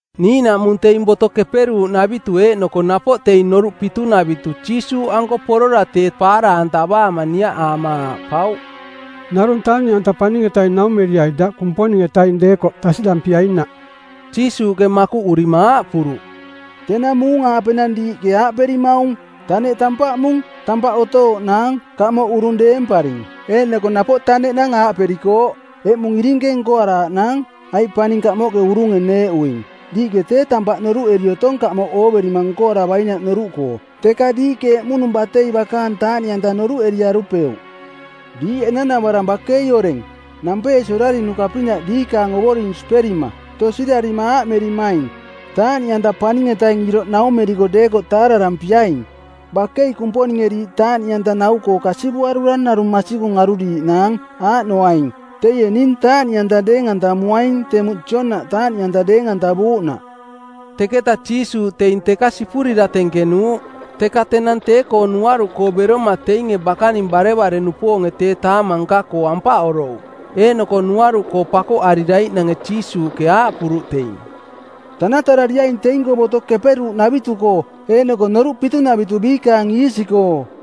Niiꞌnaꞌmung teing Boto Keperuuꞌnavitu eeꞌnoko napoꞌ teing Noruꞌ Pitunavitu Jiisuuꞌanko porora tee paara-antavaama niaꞌaama aaꞌpauꞌ, “Narung taaꞌniꞌanta Paning-etaing naumeriai daꞌ Kumponing-etaing deekoꞌ tasiꞌdampiainaꞌ.” Jiisuuꞌke makuꞌurima aaꞌpuruꞌ, “Tenang muung-aapenang diiꞌke aaꞌperimaung, ‘Taneꞌ tampaꞌmung, tampaꞌ otooꞌnaang, kamoꞌ urung deemparing.’ Eeꞌnoko napoꞌ taneꞌnang aaꞌperikooꞌ, ‘Eꞌmung irinke nkoaraaꞌnaang, aiꞌ paning kamoꞌke urunge neeꞌuing.’ Diiꞌke tee tampaꞌ noruꞌeri otong kamoꞌ ooverima nkoaravainaꞌ noruꞌkoo, teka diiꞌke emuꞌnung batei bakaang taaꞌniꞌanta noruꞌeriarupeuꞌ. Diiꞌ enanavarang bakei oreng, nampeesi orarinuka-pinaꞌ diikaang Ovoring siperima, tosirarima aaꞌmerimaing, ‘Taaꞌniꞌanta paning-etaing iroꞌ naumeriko deekoꞌ taararampiaing.’ Bakei Kumponinge diiꞌ taaꞌniꞌanta nau-anta-koo kasivuarura narung masikung aruriiꞌnaang, aaꞌnoaing: teie ning taaꞌniꞌanta deeng-antamuaing temuꞌ Joonaꞌ taaꞌniꞌanta deeng-antavuuꞌnaꞌ.” Teketa Jiisuuꞌ teing teka sipurira tenkenuuꞌ. Teka tenang tee-koo nuaruꞌkoo beroma teinge bakaning barevare-nupoonge tee taamang nka-koo ampaꞌorouꞌ. Eeꞌnoko nuaruꞌkoo pakoꞌariraiꞌnange Jiisuuꞌke aaꞌpuruꞌ teing, “Tanatarariaing teing-koo Boto Keperuuꞌnavitu-koo eeꞌnoko Noruꞌ Pitunavitu biikaang iisi-koo.”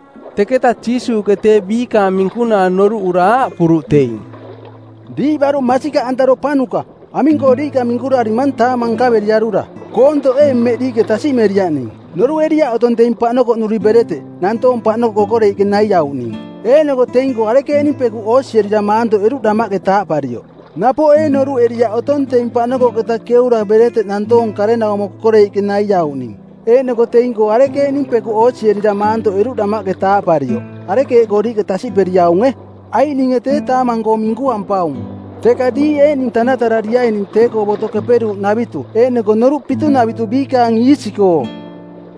Teketa Jiisuuꞌke tee biikaang minkunaa noruꞌura aaꞌpuruꞌ teing, “Diiꞌ baruꞌ masikaꞌantaropanuka, aming-koo diiꞌka minkurarimang taamang nkaveriarura? Koontoꞌ ee mmeꞌ diiꞌke tasiꞌmeriaꞌ ning? Noruꞌeriaꞌ otong teing paꞌnokoꞌnuri bereteꞌ, nantoonge paꞌnokoꞌ kokoreiꞌke naiauꞌning, eeꞌnoko teing-koo arekeeꞌning pekuꞌ oosierira maantoꞌeruꞌ damaꞌke taaꞌparioꞌ? Napoꞌ ee noruꞌeriaꞌ otong teing paꞌnokoꞌketa keura bereteꞌ nantoong karenaumo kokoreiꞌke naiauꞌning eeꞌnoko teing-koo arekeeꞌning pekuꞌ oosierira maantoꞌeruꞌ damaꞌke taaꞌparioꞌ? Arekeeꞌkoo diiꞌke tasiꞌperiaunge? Aiꞌ ninge tee taamang-koo minkuampaung. Teka diiꞌ eeꞌning tanatarariaining tee-koo Boto Keperuuꞌnavitu eeꞌnoko noruꞌ pitunavitu biikaang iisi-koo.”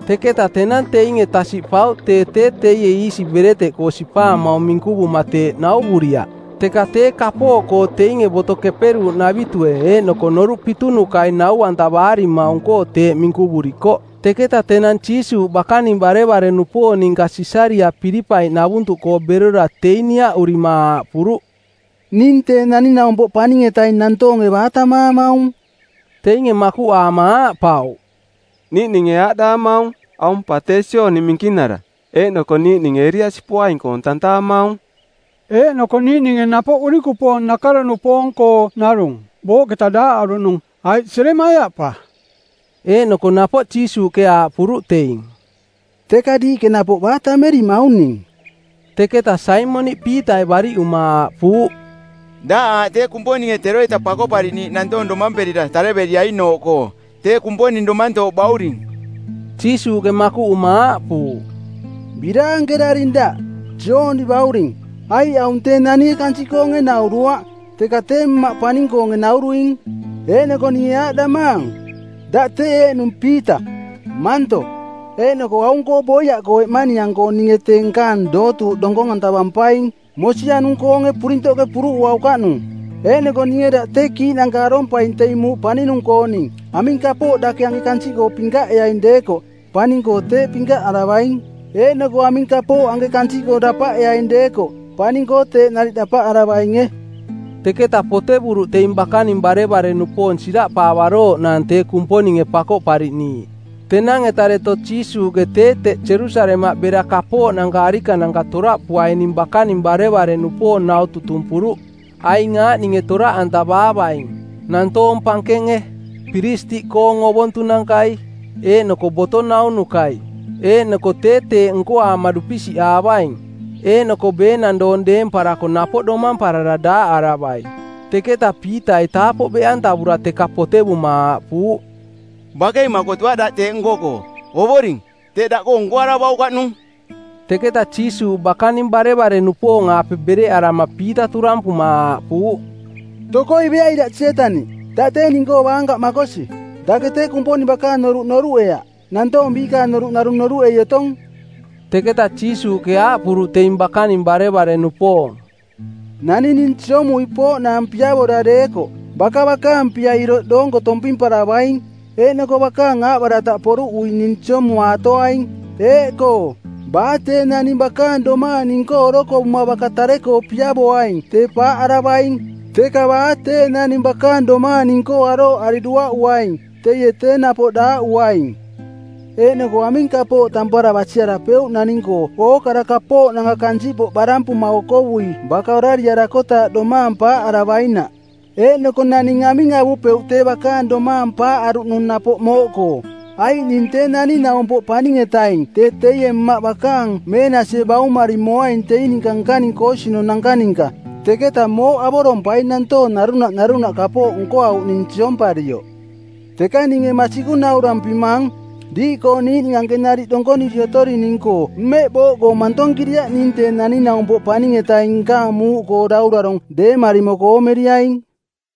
Teketa tenang teinge tasiꞌpauꞌ teie tee tee iisi bereteꞌkoo sipaamaung minkuvuma teeꞌ nauvuriaꞌ, teka tee kapooꞌkoo teinge Boto Keperuuꞌnavitue eeꞌnoko Noruꞌ Pitunukai nau-antavaarimaung-koo teeꞌ minkuvurikoꞌ. Teketa tenang Jiisuuꞌ bakaning barevare-nupoong ninka Sisariaꞌ Pilipai-navuntuꞌkoonooꞌ berora teing niaꞌurima aaꞌpuruꞌ, “Ning Tee Naning-naumpoꞌ Paning-etaing nantoonge baa tammaamaung?” Teinge makuꞌaama aaꞌpauꞌ, “Niiꞌninge aaꞌdaamaung, ‘Aung pa tee Jooni Minkinara,’ eeꞌnoko niiꞌninge Eliasi poaing-koong tantaamaung, eeꞌnoko niiꞌninge napoꞌ urikupoong nakaro-nupoong-koo narung, booꞌketa daaꞌaruꞌnung, aiꞌ Jeremaia pa.” Eeꞌnoko napoꞌ Jiisuuꞌke aaꞌpuruꞌ teing, “Teka diiꞌke napoꞌ baa tammerimaung ning?” Teketa Saimoniꞌ Piitai bariꞌuma aaꞌpuuꞌ, “Daꞌ aaꞌ tee Kumponinge teroita Pakoꞌpariꞌniiꞌ nantoong domamperira tareveriainooꞌkoo, tee Kumponing domantooꞌ bauring.” Jiisuuꞌke makuꞌuma aaꞌpuuꞌ, “Biraankeraring daꞌ, Jooni bauring, aiꞌ aung tee naninge kansiꞌkoonge nauruaꞌ, teka tee Mmaꞌke paning-koonge nauruing. Eeꞌnoko ninge aaꞌdamaang, daꞌ tee eeꞌnung Piita, Manto, eeꞌnoko aung-koo boiaꞌkoo eꞌmaniang-koo ninge tee nkaang dootuuꞌ donkong-antavampaing, mosianung-koonge purintoꞌke puruꞌuaukaꞌnung. Eeꞌnoko ninge daꞌ tee kiiꞌnanka arompaing teing muuꞌ paninung-kooning. Aming kapooꞌ dake anke kansiꞌkoo pinkaꞌeaing deekoꞌ paning-koo teeꞌ pinkaꞌaravaing, eeꞌnoko aming kapooꞌ anke kansiꞌkoo dapaꞌeaing deekoꞌ paning-koo teeꞌ nariꞌ dapaꞌaravainge.” Teketa potevuruꞌ teing bakaning barevare-nupoong siraꞌpaavarooꞌnaang tee Kumponinge Pakoꞌpariꞌniiꞌ. Tenang-eta deto Jiisuuꞌke tee teꞌ Jerusalemaꞌ bera kapooꞌnanka arikananka toraꞌpuaining bakaning barevare-nupoong nau tutumpuruꞌ. Aing aaꞌninge toraꞌantavaavaing: nantoong pankenge, piristiꞌkoong ovontunankai, eeꞌnoko boto naunukai. Eeꞌnoko tee teeꞌ nkoaama dupisiꞌaavaing, eeꞌnoko beenang doong deemparako napoꞌ domamparara daaꞌaravai. Teketa Piitai taapoꞌ beꞌantavura teka potevuma aaꞌpuuꞌ, “Bakei makotuaꞌ daꞌ teeꞌ nko-koo, Ovoring. Teeꞌ daꞌkoo nkoaravaukaꞌnung.” Teketa Jiisuuꞌ bakaning barevare-nupoong-aape bereꞌarama Piita turampuma aaꞌpuuꞌ, “Tokoi beai daꞌ Sietaniꞌ. Daꞌ tee ning-koo baankaꞌ makosi. Dake tee Kumponing bakaang noruꞌ noruꞌeaꞌ, nantoong biikaang noruꞌ narung noruꞌei otong.” Teketa Jiisuuꞌke aaꞌpuruꞌ teing bakaning barevare-nupoong, “Naning ning siomui pooꞌnaang piavora deekoꞌ, baka bakaang pia iroꞌ doonko tompimparavaing eeꞌnoko bakaang aaꞌbarataꞌ poruꞌui ning siomumaatoaing. Eeꞌkoo, baa tee naning bakaang domaang ning-koo orokovuma baka tare-koo piavoaing tee paaꞌaravaing, teka baa tee naning bakaang domaang ning-koo arooꞌari duaꞌuaing, teie tee napoꞌ daaꞌuaing. Eeꞌnoko aming kapooꞌ tampara basiarapeuꞌ naning-koo ookara kapooꞌnanka kansiꞌpoꞌ barampuma okovui baka orariarakotaaꞌ domaang paaꞌaravainaꞌ? Eeꞌnoko naning aming avupeuꞌ tee bakaang domaang paaꞌaruꞌnung napoꞌ mooꞌkoo? Aiꞌ ning Tee Naning-naumpoꞌ Paning-etaing tee teie Mmaꞌ bakaang meenasie baumari moaing teing ninka nkaning koosinunanka ninka, teketa mooꞌ avorompaing nantoong narunaꞌ narunaꞌ kapooꞌ nkoauꞌning siomparioꞌ. Teka ninge masikung naurampimang, diiꞌkoo niiꞌning anke nariꞌ donkoniri otorining-koo mmeꞌ booꞌkoo mantonkiriaꞌ ning Tee Naning-naumpoꞌ Paning-etaing nkaang muuꞌkoo Daurarong˜ deemari moko oomeriaing.”